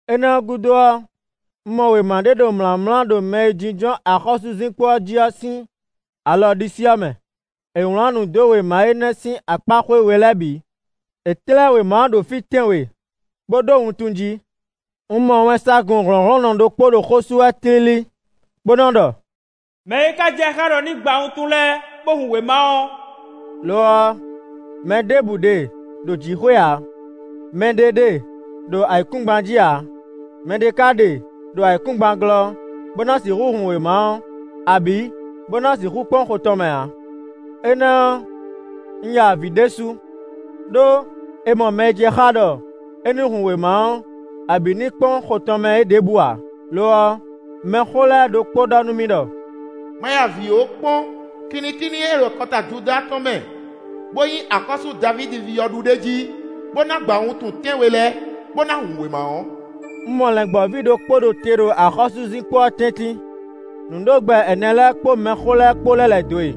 Énɛ́ ɔ́ gúdo ɔ́, un mɔ wěma ɖé ɖo mlǎmlá ɖo mɛ e jínjɔ́n axɔ́súzinkpo jí ɔ́ sín alɔ ɖisí ɔ́ mɛ; è wlán nǔ dó wěma énɛ́ sín akpáxwé we lɛ́ɛ bǐ; è tlɛ́ wěma ɔ́ ɖo fí tɛ́nwe, bó ɖó wuntun jí. Un mɔ wɛnsagun hlɔ̌nhlɔ́nnɔ ɖokpó ɖo xó sú wɛ tlílí, bó nɔ ɖɔ: “Mɛ̌ é ka jɛ xá ɖɔ é nǐ gba wuntun lɛ́ɛ, bó hun wěma ɔ́.” Lo ɔ́, mɛ ɖěbǔ ɖe ɖo jǐxwé ǎ; mɛɖé ɖe ɖo ayǐkúngban jí ǎ; mɛɖé ka ɖe ɖo ayǐkúngban glɔ́, bó ná sixú hun wěma ɔ́, abǐ bó ná sixú kpɔ́n xo tɔn mɛ ǎ. Énɛ́ ɔ́, un ya avǐ ɖésú, ɖó è mɔ mɛ e jɛ xá ɖɔ é ní hun wěma ɔ́, abǐ ní kpɔ́n xo tɔn mɛ é ɖěbǔ ǎ. Lo ɔ́, mɛxó lɛ́ɛ ɖokpó ɖɔ nú mì ɖɔ: “Ma ya avǐ ó, kpɔ́n: kinnikínní e ɖo akɔta Judáa tɔn mɛ, bó nyí axɔ́sú Davídi ví ɔ́ ɖu ɖ'é jí, bó ná gba wuntun tɛ́nwe lɛ́ɛ, bó ná hun wěma ɔ́.” Un mɔ Lɛ̌ngbɔ́ví ɖokpó ɖo te ɖo axɔ́súzinkpo ɔ́ tɛ́ntin; nǔɖogbɛ ɛnɛ lɛ́ɛ kpó mɛxó lɛ́ɛ kpó lɛ́ lɛ̌ dó e.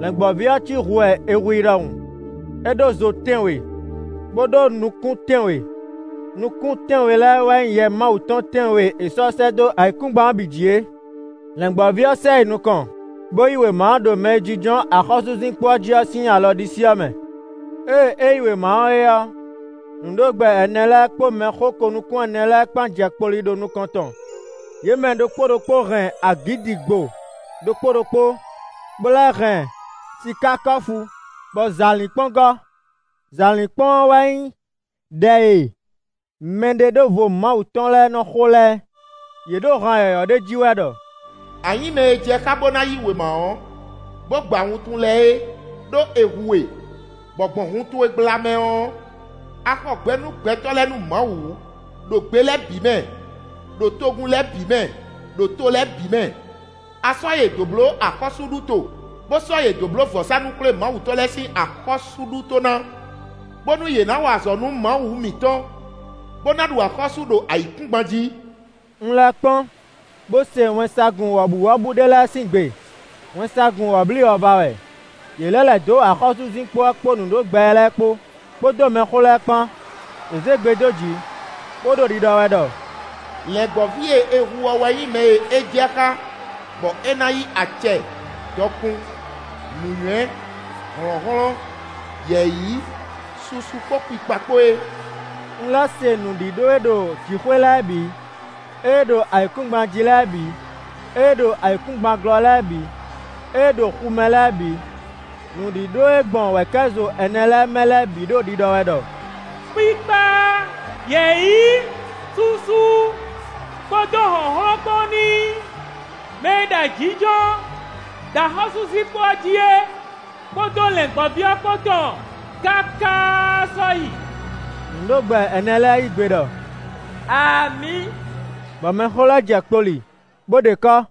Lɛ̌ngbɔ́ví ɔ́ cí hu wɛ è hu i ɖɔhun; é ɖó zo tɛ́nwe, bó ɖó nukún tɛ́nwe; nukún tɛ́nwe lɛ́ɛ wɛ nyí Yɛ Mawu tɔn tɛ́nwe e è sɔ́ sɛ́ dó ayǐkúngban ɔ́ bǐ jí é. Lɛ̌ngbɔ́ví ɔ́ sɛ yi nukɔn, bó yí wěma ɔ́ ɖo mɛ e jínjɔ́n axɔ́súzinkpo ɔ́ jí ɔ́ sín alɔ ɖisí ɔ́ mɛ. Ée é yí wěma ɔ́ é ɔ́, nǔɖogbɛ ɛnɛ lɛ́ɛ kpó mɛxó ko-nukún-ɛnɛ lɛ́ɛ kpán jɛ kpoli ɖo nukɔn tɔn. Yě mɛ ɖokpó ɖokpó hɛn agǐdigbo ɖokpó ɖokpó, bó lɛ́ hɛn sikákɔ́fu, bɔ zǎlínkpɔ́n gɔ́. Zǎlínkpɔ́n ɔ́ wɛ nyí ɖɛ e mɛɖeɖóvo Mawu tɔn lɛ́ɛ nɔ xo lɛ́ɛ. Yě ɖo han yɔ̌yɔ́ ɖé ji wɛ ɖɔ: “A nyǐ mɛ e jɛ xá bó ná yí wěma ɔ́, bó gba wuntun lɛ́ɛ é; ɖó è hu we, bɔ gbɔn hun towe gbla mɛ ɔ́, a xɔ gbɛ nú gbɛtɔ́ lɛ́ɛ nú Mawu, ɖo gbe lɛ́ɛ bǐ mɛ, ɖo togun lɛ́ɛ bǐ mɛ, ɖo to lɛ́ɛ bǐ mɛ. A sɔ́ yě dó bló axɔ́súɖuto, bó sɔ́ yě dó bló vɔ̌sánú-xwlémawutɔ́ lɛ́ɛ sín axɔ́súɖuto ná, bónú yě ná wa azɔ̌ nú Mawu mǐtɔn, bó ná ɖu axɔ́sú ɖo ayǐkúngban jí.” Un lɛ́ kpɔ́n bó se wɛnsagun wɔ̌buwɔ́bú ɖé lɛ́ɛ sín gbe; wɛnsagun wɔ̌bliwɔ̌va wɛ; yě lɛ́ lɛ̌ dó axɔ́súzinkpo ɔ́ kpó nǔɖogbɛ lɛ́ɛ kpó, kpódó mɛxó lɛ́ɛ kpán. Yě zé gbe dó jǐ bó ɖo ɖiɖɔ wɛ ɖɔ: “Lɛ̌ngbɔ́ví e è hu ɔ́ wɛ nyí mɛ e é jɛ xá bɔ é ná yí acɛ, dɔkun, nǔnywɛ́, hlɔ̌nhlɔ́n, yɛ̌yi, susu kpó kpikpa kpó é.” Un lɛ́ se nǔɖíɖó e ɖo jǐxwé lɛ́ɛ bǐ, ée ɖo ayǐkúngban jí lɛ́ɛ bǐ, ée ɖo ayǐkúngban glɔ́ lɛ́ɛ bǐ, ée ɖo xu mɛ lɛ́ɛ bǐ; nǔɖíɖó e gbɔn wɛ̌kɛ́zo ɛnɛ lɛ́ɛ mɛ lɛ́ɛ bǐ ɖo ɖiɖɔ wɛ ɖɔ: “Kpikpa, yɛ̌yi, susu, kpódó hlɔ̌nhlɔ́n kpó ní nyí mɛ e ɖo ayǐjínjɔ́n ɖo axɔ́súzinkpo ɔ́ jí é kpódó Lɛ̌ngbɔ́ví ɔ́ kpó tɔn káká sɔ́yi!” Nǔɖogbɛ ɛnɛ lɛ́ɛ yí gbe ɖɔ: “Amǐ!” Bɔ mɛxó lɛ́ɛ jɛ kpoli bó ɖe kɔ́.